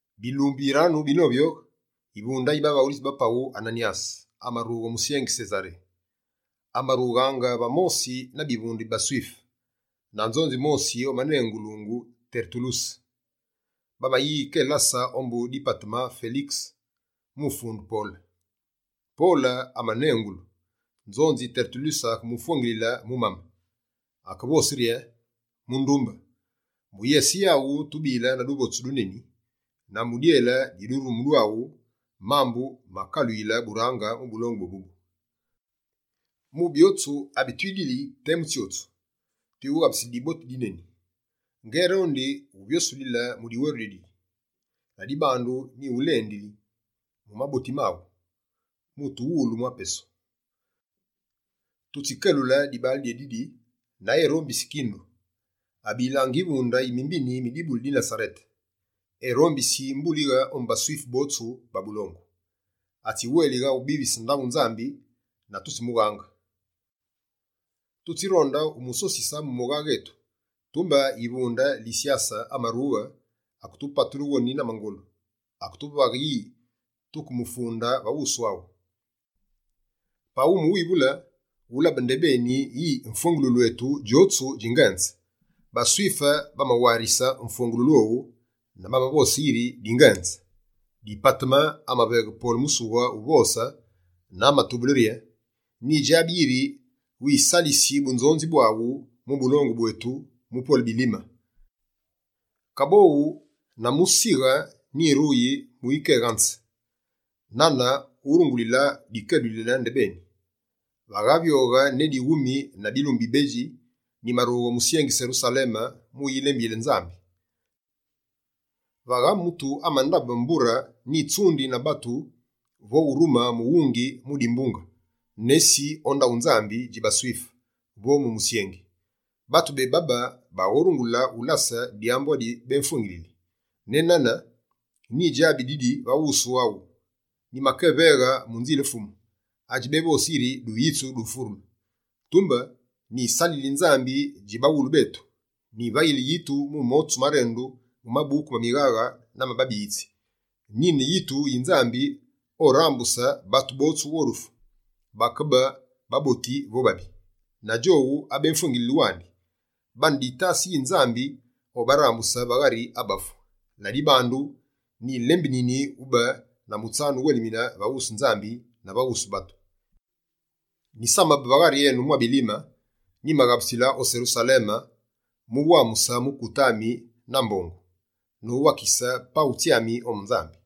Bilumbu biranu binovyoghe, yivunde yi bavaghulitsi ba paghu Ananyase, amarughe o musyengi Sesaré. Amarughaange va mosi na bivunde bi baSwife, na nzonzi mosi omanengulu Tertuluse. Bamayikelase ombu Dipateme Felikese mu ufunde Pole. Pole amanengulu, nzonzi Tertuluse akemufwengilile mu mame. Akevose yi: «Mundumbe, mu yese yaghu tubile na duvotsu duneni, na mu dyele di durumu dwaghu, mambu makaluyile burange mu bulongu bwébubu. Mu byotsu abi twidili temu tsyotsu, twiwughabusili diboti dyneni. Ngérondi wuvyosulile mu diweru dyaghu. Ladibandu, nyighulendi mu maboti maghu, mu utuwulu mwa pesu. Tutsikelule dibaale dyédidi na erombisi kindu. Abilaange yivunde yi mimbini mi dibuli di Nasarete, erombisi mbulighe ombu baSwife botsu ba bulongu. Atsiwélighe ubivise ndaghu Nzambi na tutsimughange. [Tutsironde umusosise mu mughaghe etu, tumbe yivunde Lisyase amarughe. Aketupatule woni na mangolu. Aketuvaghe yi tukemufunde va wusu aghu.] Pa wumuwivule, wulabe ndebeni yi mfwengululu etu djotsu dji ngenze.» BaSwife bamawarise mfwengululu owu, na bamavose yiri dingenze. Dipateme amaveghe Pole musughe uvose na amatubule rye: «Nyidjabi yiri wisalisi bunzonzi bwaghu mu bulongu bwetu mu pwele bilime, kaboghu na musighe nyiruyi mu ukéghanze. Nane wurungulile dikelulile ndebeni, vakavyoghe ne dighumi na bilumbu bibedji, nyimarughe o musyengi Serusaleme, mu ulembiyile Nzambi. Vagha mutu amandabe mbure nyitsundi na batu vo urume mughungi mu dimbunge, nesi o ndaghu Nzambi dji baSwife, vo mu musyengi. Batu bébabe baghorungule ulase dyambu adi béfwengilili. Ne nane, nyidjabi didi va wusu waghu: nyimakéveghe mu Nzile Fumu, adji bévosi yiri duyitsu du mfurulu. Tumbe, nyisalili Nzambi dji baghulu betu, nyivayili yitu mu motsu marendu mu Mabuku ma Mighaghe na ma Babiyitsi. Nyine yitu yi Nzambi orambuse batu botsu o dufu, bakebe baboti vo babi. Na djowu abémfwengilili wandi, bane ditase yi Nzambi obarambuse va ghari abafu. Ladibandu, nyilembinini ube na mutsanu wuwelimine va wusu Nzambi na va wusu batu.» «Nyisamabe va ghari enu mwa bilime, nyimaghabusile o Serusaleme mu wamuse mukute ami na mbongu, nowakise paghu tsyami ombu Nzambi.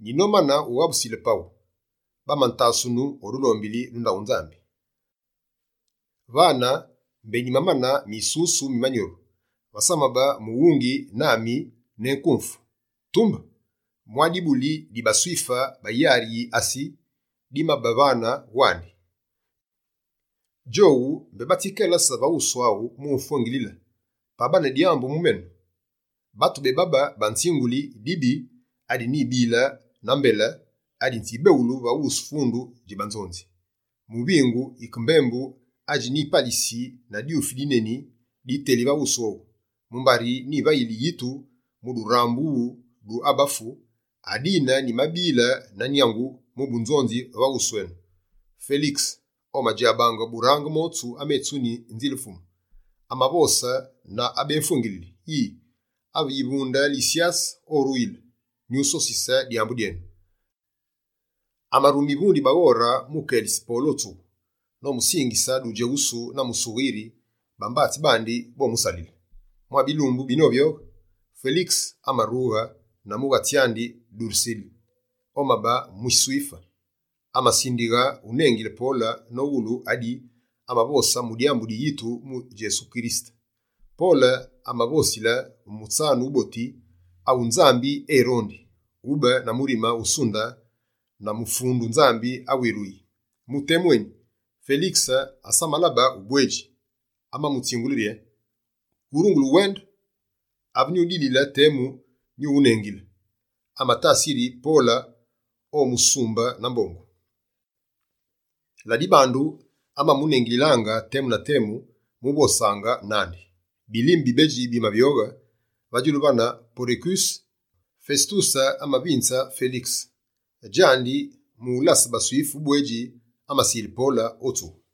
Nyinomane ughabusile paghu, bamantasunu o dulombili du ndaghu Nzambi. Vane mbé nyimamane misusu mi manyuru. Vasamabe mughungi nami ne nkumfu. Tumbe, mwa dibuli di baSwife ba yari yi Asi dimabe vane wandi. Djowu, mbé batsikelase va wusu aghu mu mfwengilile, pa bane dyambu mu menu. Batu bébabe banzinguli dibi adi nyibile na mbele, adi nzibeghulu va wusu fundu dji banzonzi. Muvingu yike mbembu adji nzipalise na dwufi dineni, diteli va wusu owu: “Mumbari nyivayili yitu mu durambughulu du abafu, adine nyimabile na nyangu mu bunzonzi va wusu enu!”» Felikese, omadjabaange burange motsu ametsuni Nzile Fumu. Amavose na abémumfwengilili yi: «Ave yivunde Lisyase oruyile, nyusosise dyambu dyenu.» Amarume yivunde yi baghore mu kelisa Pole o tsughu, nomusingise dudjeghusu na musughe yiri bambatsi bandi bomusalile. Mwa bilumbu binovyoghe, Felikese amarughe na mughatsi andi Duresile, omabe muSwife. Amasindighe unengile Pole nowulu adi amavose mu dyambu di yitu mu Djesu Kirisete. Pole amavosile mu mutsanu wuboti awu Nzambi erondi, ube na murime usunde na mufundu Nzambi awiruyi. Mu temu eni, Felikese, asamalabe ubwedji, amamutsingule rye: «Wurungule uwende. Ave nyudilile temu, nyuwunengile.» Amatase yiri Pole omusumbe na mbongu. Ladibandu, amamunengililaange temu na temu mu vosaange nandi. Bilime bibedji bimavyoghe, va djulu vane Porekuse Fesetuse amavinze Felikese. Djandi, mu ulase baSwife ubwedji, amasile Pole o tsughu.